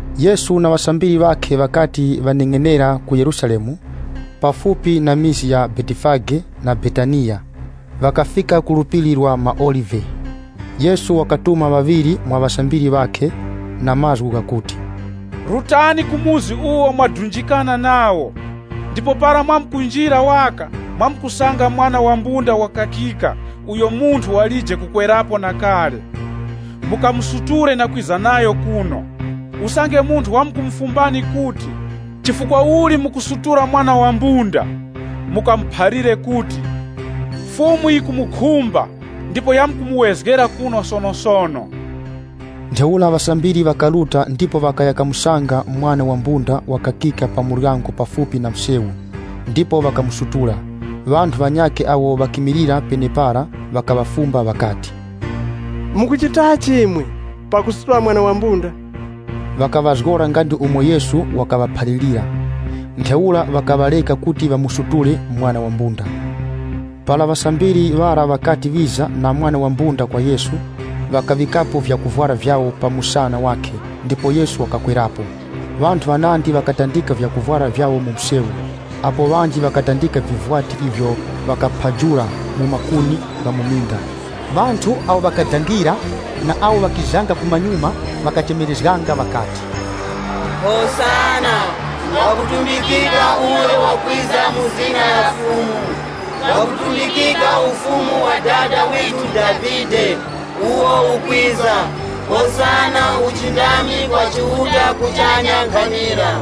Yesu na ŵasambiri ŵakhe ŵakati ŵaneng'enera ku Yerusalemu, pafupi na mizi ya Betifage na Betaniya, ŵakafika ku Phiri la maOlive. Yesu wakatuma ŵaŵiri mwa ŵasambiri ŵakhe, na mazgu ghakuti, “Rutani ku chikaya icho mwadunjikana nacho, ndipo para mwamkunjira waka mwamkusanga mwana wa mbunda wakakika uyo munthu walije kukwerapo na kale. Mukamusutule na kwiza nayo kuno. Usange munthu wamkumufumbani kuti, ‘Chifukwa uli mukusutula mwana wa mbunda?’ Mukamuphalire kuti, ‘Fumu yikumukhumba ndipo yamkumuwezgera kuno sonosono.’” Ntheura ŵasambiri ŵakaruta ndipo ŵakaya kamusanga mwana wa mbunda wakakika pa muryango pafupi na msewu, ndipo ŵakamusutula. Ŵanthu ŵanyakhe awo ŵakimilira penepara ŵakaŵafumba ŵakati, “Mukuchitachi imwe pakusutula mwana wa mbunda?” Ŵakaŵazgora nga ndi umo Yesu wakaŵaphalirira. Ntheura ŵakaŵareka kuti ŵamusutule mwana wa mbunda. Para ŵasambiri ŵara ŵakati ŵiza na mwana wa mbunda kwa Yesu, ŵakaŵikapo vyakuvwara vyawo pa muwongo wakhe ndipo Yesu wakakwerapo. Ŵanthu ŵanandi ŵakatandika vyakuvwara vyawo mu msewu, apo ŵanji ŵakatandika vivwati ivyo ŵakaphajula mu makuni gha mu minda. Ŵanthu awo ŵakadangira na awo ŵakizanga kumanyuma ŵakachemerezganga ŵakati, “Hosana! Ngwakutumbikika uyo wakwiza mu zina la Fumu! Ngwakutumbikika ufumu wa Dada withu Davide uwo ukwiza, Hosana, uchindami kwa Chiuta kuchanya nkhanira.”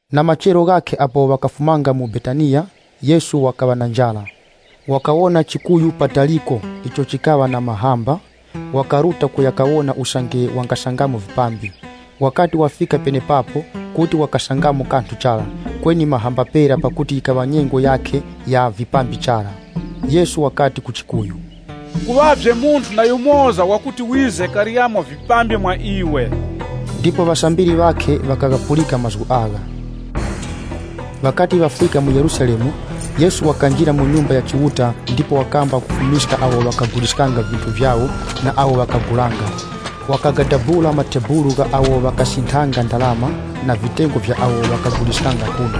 Na machero ghakhe apo ŵakafumanga mu Betaniya, Yesu wakaŵa na njara. Wakawona chikuyu pataliko icho chikaŵa na mahamba, wakaruta kuya kawona usange wangasangamo vipambi. Wakati wafika penepapo, kuti wakasangamo kanthu chara, kweni mahamba pera pakuti yikaŵa nyengo yakhe ya vipambi chara. Yesu wakati ku chikuyu, “Kuŵavye munthu na yumoza wakuti wize karyemo vipambi mwa iwe.” Ndipo ŵasambiri ŵakhe ŵakaghapulika mazgu agha. Ŵakati ŵafika mu Yerusalemu, Yesu wakanjira mu Nyumba ya Chiuta ndipo wakamba kufumiska awo ŵakaguliskanga vinthu vyawo na awo ŵakagulanga. Wakagadabula matebulu gha awo ŵakasinthanga ndarama na vitengo vya awo ŵakaguliskanga nkhunda.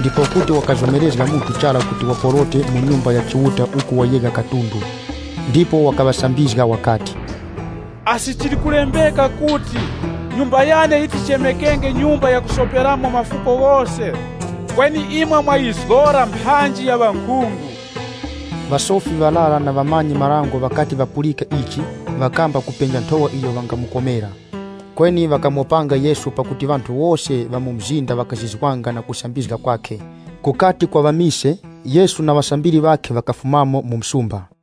Ndipo kuti wakazomerezga munthu chara kuti waporote mu Nyumba ya Chiuta uku wayegha katundu. Ndipo wakaŵasambizga wakati, “Asi chili kulembeka kuti, ‘Nyumba yane yiti yichemekenge nyumba yakuromberamo mafuko ghose?’ Kweni imwe mwayizgora mphanji ya ŵankhungu!” Ŵasofi ŵarara na ŵamanyi-marango ŵakati ŵapulika ichi, ŵakamba kupenja nthowa iyo ŵangamukomera. Kweni ŵakamopanga Yesu pakuti ŵanthu wose ŵa mu mzinda ŵakazizwanga na kusambizga kwakhe. Kukati kwaŵa mise, Yesu na ŵasambiri ŵakhe ŵakafumamo mu msumba.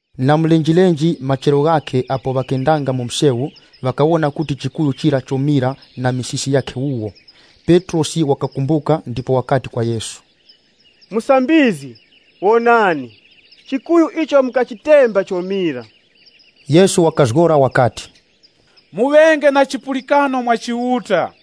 Na mulenjelenje machero ghakhe, apo ŵakendanga mu msewu ŵakawona kuti chikuyu chira chomira na misisi yakhe wuwo. Petrosi wakakumbuka ndipo wakati kwa Yesu, “Musambizgi, wonani! Chikuyu icho mukachitemba chomira.” Yesu wakazgora wakati, “Muŵenge na chipulikano mwa Chiuta.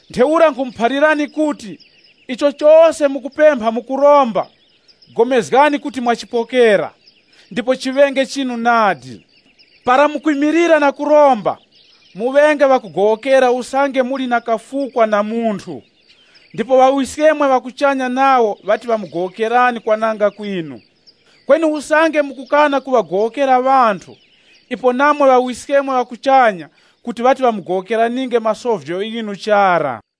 Ntheura nkhumuphalirani kuti, chose icho mukupempha mu kuromba, pulikanani kuti mwachipokera, ndipo chiŵenge chinu nadi. Para mukwimilira na kuromba, muŵenge ŵakugowokera usange muli na kafukwa na munthu. Ndipo Ŵawiskemwe ŵa kuchanya nawo ŵati ŵamugowokerani kwananga kwinu.” [ Kweni usange mukukana kuŵagowokera ŵanthu, ipo namwe ŵawiskemwe ŵa kuchanya kuti ŵati ŵamugowokeraninge masovyo ghinu chara.]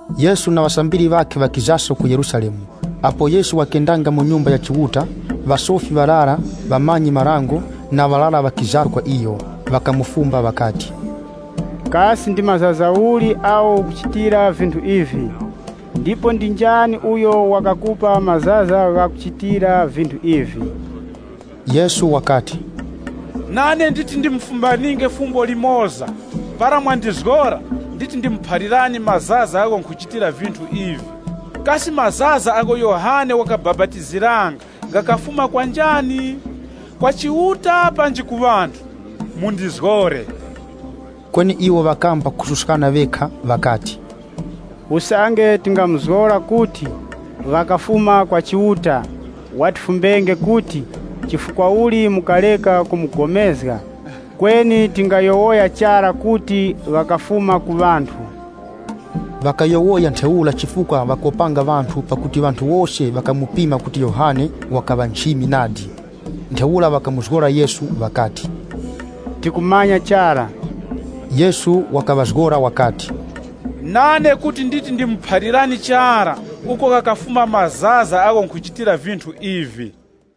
Yesu na ŵasambiri ŵakhe ŵakizaso ku Yerusalemu. Apo Yesu wakendanga mu Nyumba ya Chiuta, ŵasofi ŵarara, ŵamanyi-marango, na ŵarara ŵakiza kwa iyo. Ŵakamufumba ŵakati, “Kasi ndi mazaza uli agho ukuchitira vinthu ivi? Ndipo ndi njani uyo wakakupa mazaza ghakuchitira vinthu ivi?” Yesu wakati, “Nane nditi ndimufumbaninge fumbo limoza, para mwandizgora, nditi ndimuphalirani mazaza agho nkhuchitira vinthu ivi. Kasi mazaza agho Yohane wakabapatiziranga ghakafuma kwa njani? Kwa Chiuta panji ku ŵanthu? Mundizgore!” Kweni iwo ŵakamba kususkana ŵekha ŵakati, “Usange tingamuzgora kuti, ‘Ghakafuma kwa Chiuta’ watifumbenge kuti, ‘Chifukwa uli mukareka kupulikana?’ Kweni tingayowoya chara kuti, ‘Ghakafuma ku ŵanthu.’” (Ŵakayowoya ntheura chifukwa ŵakopanga ŵanthu pakuti ŵanthu wose ŵakamupima kuti Yohane wakaŵa nchimi nadi.) Ntheura ŵakamuzgora Yesu ŵakati, “Tikumanya chara.” Yesu wakaŵazgora wakati, “Nane kuti nditi ndimuphalirani chara uko ghakafuma mazaza agho nkhuchitira vinthu ivi.”